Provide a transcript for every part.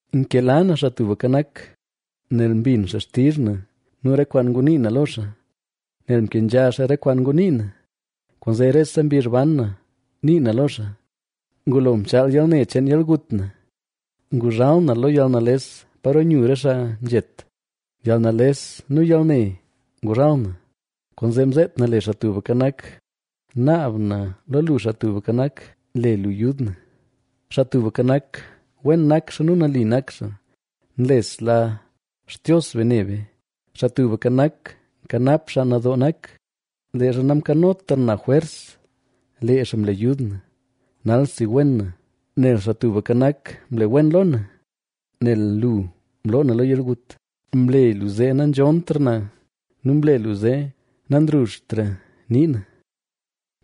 Nkela na Xaa Tubka Nak, nel mbin xaa xtizh na nu re kwaan ngunii na lo xaa. Nel mkenzha xaa re kwaan ngunii na, kwaanzee rese mbizh ban na nii na lo xaa. Ngulo mchaal yalne cheen yalgut na, nguzhal na lo yalnales paro nyu re xaa nzhet; yalnales nu yalne nguzhal na. Kwaanzee mzeet na le Xaa Tubka Nak: “¡Naab na lo lu, Xaa Tubka Nak, le lu yud na!” Xaa Tubka Nak, wen nak xaa nu nali nak xaa; nlesla Xtios be ne be. Xaa Tubka Nak nkanap xaa nadoo nak; leezha namkanotra na jwers lee xaa mle yud na. ¡Nalsi wen na, nel Xaa Tubka Nak mle wen lo na! Nel lu mloo na lo yalgut, mle lu zee nanzhontra na nu mle lu zee nanruzhtra nii na.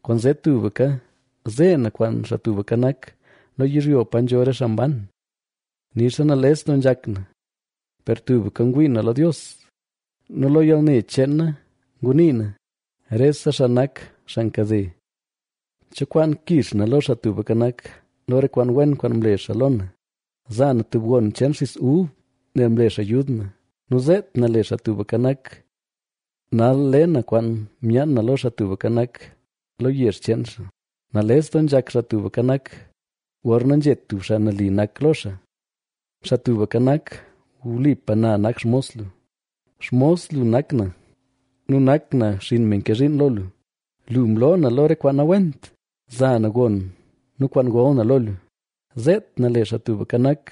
Kwaanzee tubka zee na kwaan Xaa Tubka Nak, lo yizhyo pa nzho re xaa mban. Nixa nales doo nzhak na, per tubka ngwii na lo Dios. Nu lo yalne cheen na ngunii na: “Rese xaa nak xaa nkade.” ¿Cho kwaan kix na lo Xaa Tubka Nak, lo re kwaan wen kwaan mle xaa lo na? Za na tub gon cheen xis ub nel mle xaa yud na nu zeet na le Xaa Tubka Nak. Nal le na kwaan myaan na lo Xaa Tubka Nak, lo yezh cheen xaa. Nales doo nzhak Xaa Tubka Nak, gorna nzhet tub xaa nali nak lo xaa. Xaa Tubka Nak, wlipa na nak xmos lu, xmos lu nak na, nu nak na xinn me nke zhiin lo lu. Lu mloo na lo re kwaan nawent. Za na gon nu kwaan gol na lo lu, zeet na le Xaa Tubka Nak.